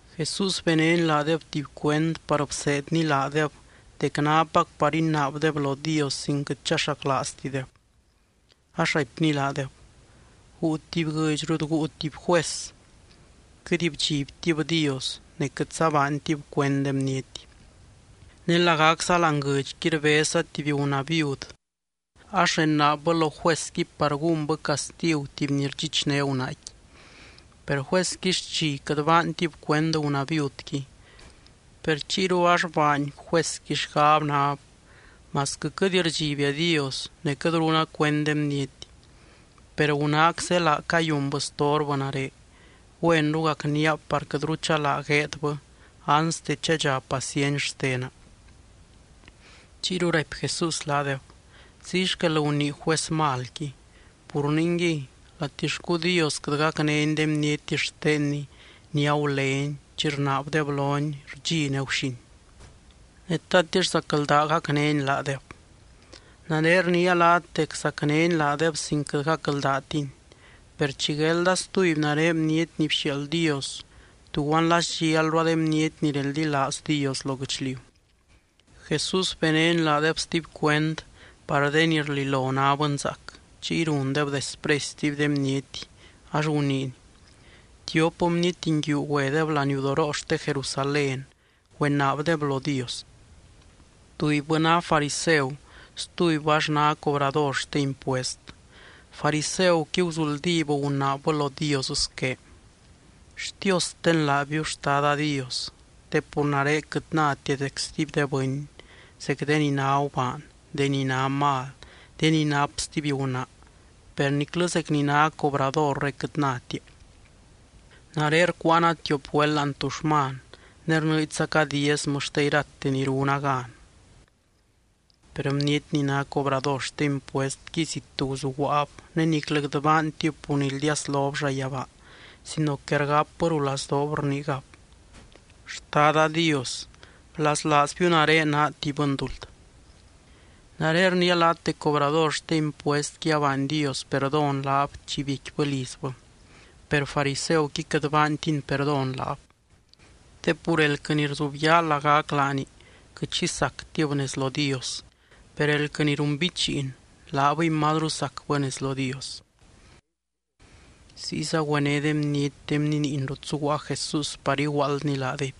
Jesús benény laadeb tuby cuend, par bseedny laadeb dec nápac par inaabdeb lo Dios sin quɨt chaxaclaaztideb. Ax raipny laadeb: —Guu tuby guɨdx rut guu tuby juez. Quɨt bdxibtib Dios, ne quɨtza baantib cuend de bniety. Ne lagacza láani guɨdxqui rbezza tuby gunaa viud, ax renaabbɨ lo juezqui par gúnbɨ castigu tuby ni rdxichné gunaaqui. Per juezqui xchi quɨt baantib cuend gunaa viudqui, per chiyru ax baany juezqui xgab nab: “Masquɨ quɨt rdxibia Dios, ne quɨt runa cuend de bniety, per gunaac zélaa cayunbɨ storbɨ nare. Güenru gacníab par quɨtru chalaa gueedbɨ anste chadxa paciency xtena.” Chiyru raipy Jesús laadeb: —Ziy xquel gunii juez malqui. Pur ningui, latixcu Dios quɨt gacnény de bniety xtenny ni agulény chi rnaabdeb lony rdxi ne guxin. Ne, ¿tatix zacldaa gacnény laadeb? Nare rniia laat dec zacnény laadeb sin quɨt gacldaatiny. Per chi guelda stuby nare Bniety ni bxiaald Dios, ¿tuguan la sdxialrua de bniety ni reldilaaz Dios lo guɨchliu? Jesús benény laadeb stuby cuend, par de ni rlilo ná bɨnzaac, chiy rundeb despresy stuby de bniety, ax guniiny: —Tiop bniety nguiu güedeb laniudoroo xte Jerusalén güenaabdeb lo Dios: tubybɨ ná fariseu, stubybɨ ax ná cobrador xte impuest. Fariseuqui, guzuldíb gunaabbɨ lo Dios squé: “Xtiosten laabiu, Xtada Dios, te pur nare quɨt nátia zec stuby de bɨny, zec de ni ná gubaan, de ni ná mal, de ni nap stuby gunaa, per niclɨ zec ni ná cobradore quɨt nátia. Nare rcuuana tiop güelt láani tuxman, ne rnɨɨdxzaca diezmɨ xte irate ni runa gan.” Per bniety ni ná cobrador xte impuestqui, zit guzuguaab ne niclɨ quɨt baantib pur nildiaslob llayabaa, sino que rgapbɨ rulazdoob rniigab: “¡Xtada Dios, blaslaazbiu nare naa tuby bɨnduld!” Nare rniia laat dec cobrador xte impuestqui abaany Dios perdón laab chi biecquibɨ lizbɨ, per fariseuqui quɨt baantiny perdón laab. Te pur elquɨ ni rzubyaa lagac laani quɨt xi sactib nez lo Dios. Per elquɨ ni runbichiin, laabɨy mazru sacbɨ nez lo Dios. Ziyza güené de bniety de bniniin rut zuguaa Jesús par iguaaldny laadeby.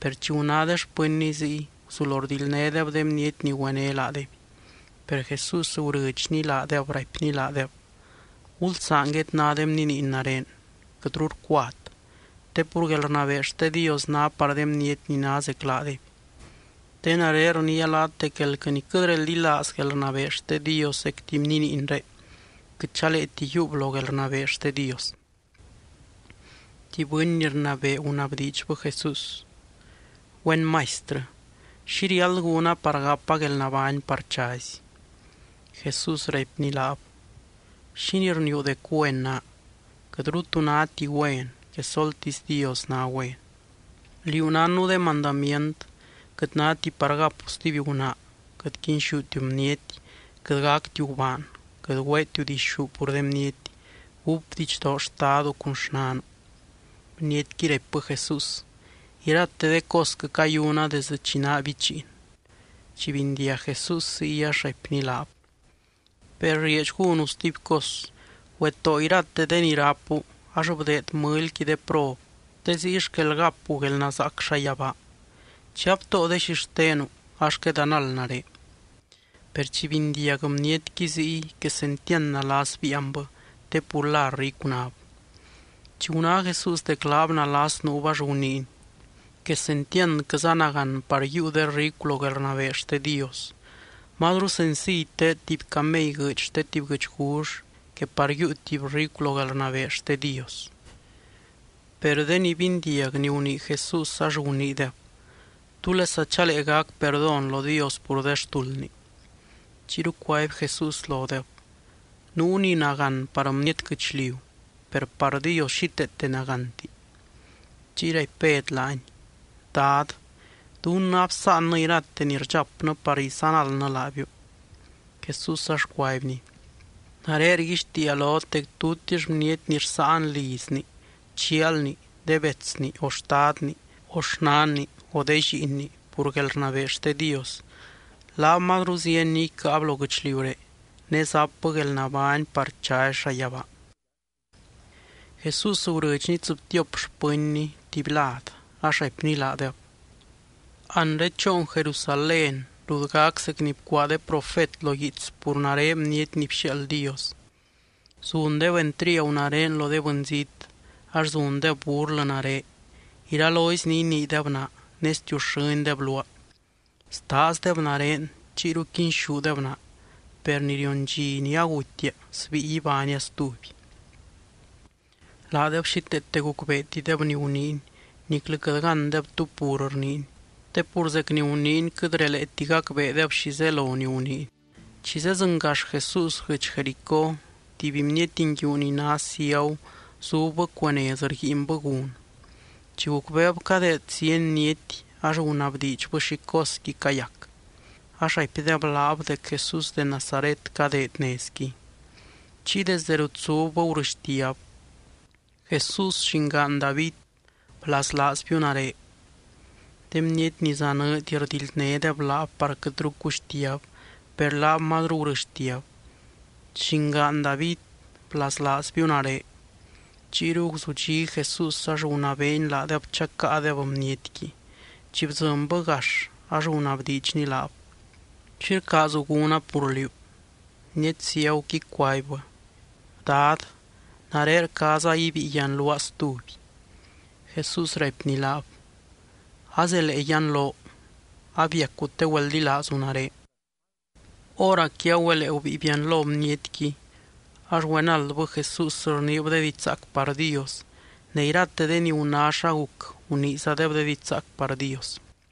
Per chi guná de xpɨnny ziy, guzulo rdildnédeb de bniety ni güené laadeby. Per Jesús gurɨdxny laadeb, raipny laadeb: —Gulsaan guedná de bniniin nare, quɨtru rcuat. Te pur guelrnabee xte Dios ná par de bniety ni ná zec laadeby. Te nare rniia laat dec elquɨ ni quɨt reldilaaz guelrnabee xte Dios zec tuby bniniinré, quɨt chaleeti yiiub lo guelrnabee xte Dios. Tuby bɨny ni rnabee gunabdiidxbɨ Jesús: —Güen Maistrɨ, ¿Xi riáld gúna par gapa guelnabány par chazy? Jesús raipny laab: —¿Xínii rniiu dec güen naa? Quɨtru tu náti güen, quesoltisy Dios ná güen. Liú nánnu de mandamient: “Quɨt náti par gapu stuby gunaa. Quɨt quinxútiu bniety. Quɨt gactiu gubaan. Quɨt güeetiu dixú pur de bniety. Gúp didxdoo xtadu cun xnanu.” Bnietqui raipbɨ Jesús: —Irate de cosquɨ cayuna desdɨ chi naa bichiin. Chi bindiag Jesús ziy ax raipny laab: —Per rieedx gúnu stuby cos: güetóo irate de ni rápu ax bdeed mɨlyqui de prob, te ziy xquel gapu guelnazaac llayabaa. Chi abtóo de xixtenu, ax quedanald nare. Per chi bindiag bnietqui ziy, quesentiand nalas biianbɨ, te pur la ricu náb. Chi guná Jesús dec laab nalas nuub, ax guniiny: —¡Quesentiandquɨza nagán par yiiu de ricu lo guelrnabee xte Dios! Mazru senciy teed tuby camey guɨɨdy xte tuby guɨchgull, que par yiiu tuby ricu lo guelrnabee xte Dios. Per de ni bindiag ni gunii Jesús ax guniideb: —¿Túlesa chalee gac perdón lo Dios pur de xtuldni? Chiyru cuaby Jesús lodeb: —Nuu ni nagán par bniety guɨchliu, per par Dios xíteete nagánti. Chiy raipy Bed laany: —Dad, dunnɨ absáannɨ irate ni rdxapnɨ par izanaldnɨ laabiu. Jesús ax cuaibny: —Nare rguixtiia lot, dec tutix bniety ni rsáan lizni, chialni, de betsni, o xtadni, o xnanni, o de lliinni, pur guelrnabee xte Dios, laab mazru zieny ni icáab lo guɨchliuré. Ne zapbɨ guelnabány par chazy llayabaa. Jesús gurɨdxny tsɨbtiop xpɨnny tuby lad, ax raipny laadeb: —Anre choon Jerusalén rut gac zec ni bcuaa de profet lo guiits pur nare Bniety ni bxiaald Dios. Zundeb entriagu nare lo de bɨnzít, ax zundeb burlɨ nare, iralozy ni iniideb naa ne stiuxɨ́ndeb luaa. Staazdeb nare, chiyru quinxúdeb naa. Per ni rion dxi ni agutia, sbíi ibánia stuby. Laadeb xíteete gucbeetideb ni guniiny, niclɨ quɨt gándeb tú pur rniiny, te pur zec ni guniiny quɨt releeti gacbeedeb xi zelo ni guniiny. Chi zedzɨngax Jesús guɨdx Jericó, tuby bniety nguiu ni ná ciagu zubbɨ cuee nez rguiinbɨ gun. Chi gucbeeb cadeed zieny bniety, ax gunabdiidxbɨ xi cosqui cayac. Ax raipdeb laab dec Jesús de Nazaret cadeed nezqui. Chiy desde rut zubbɨ gurɨxtiab: —¡Jesús, llingaan David, blaslaazbiu nare! De bniety ni zanɨɨdy rdildnédeb laab par quɨtru cuxtiab, per laab mazru gurɨxtiab: —¡Llingaan David, blaslaazbiu nare! Chiyru guzudxí Jesús ax gunabeeny laadeb chacáadeb bnietqui. Chi bdzɨnbɨ gax ax gunabdiidxny laab: —¿Xi rcaazu gúna pur liú? Bniety ciaguqui cuaibbɨ: —Dad, nare rcaaza ibíi yianluaa stuby. Jesús raipny laab: —¡Azelee yianloo! Abiacu te güeldilaazu nare. Hóracqui agüelee gubíi bianlo bnietqui, ax güenaldbɨ Jesús rniib de diidx zaac par Dios. Ne irate de ni guná xa guc, guniizadeb de diidx zaac par Dios.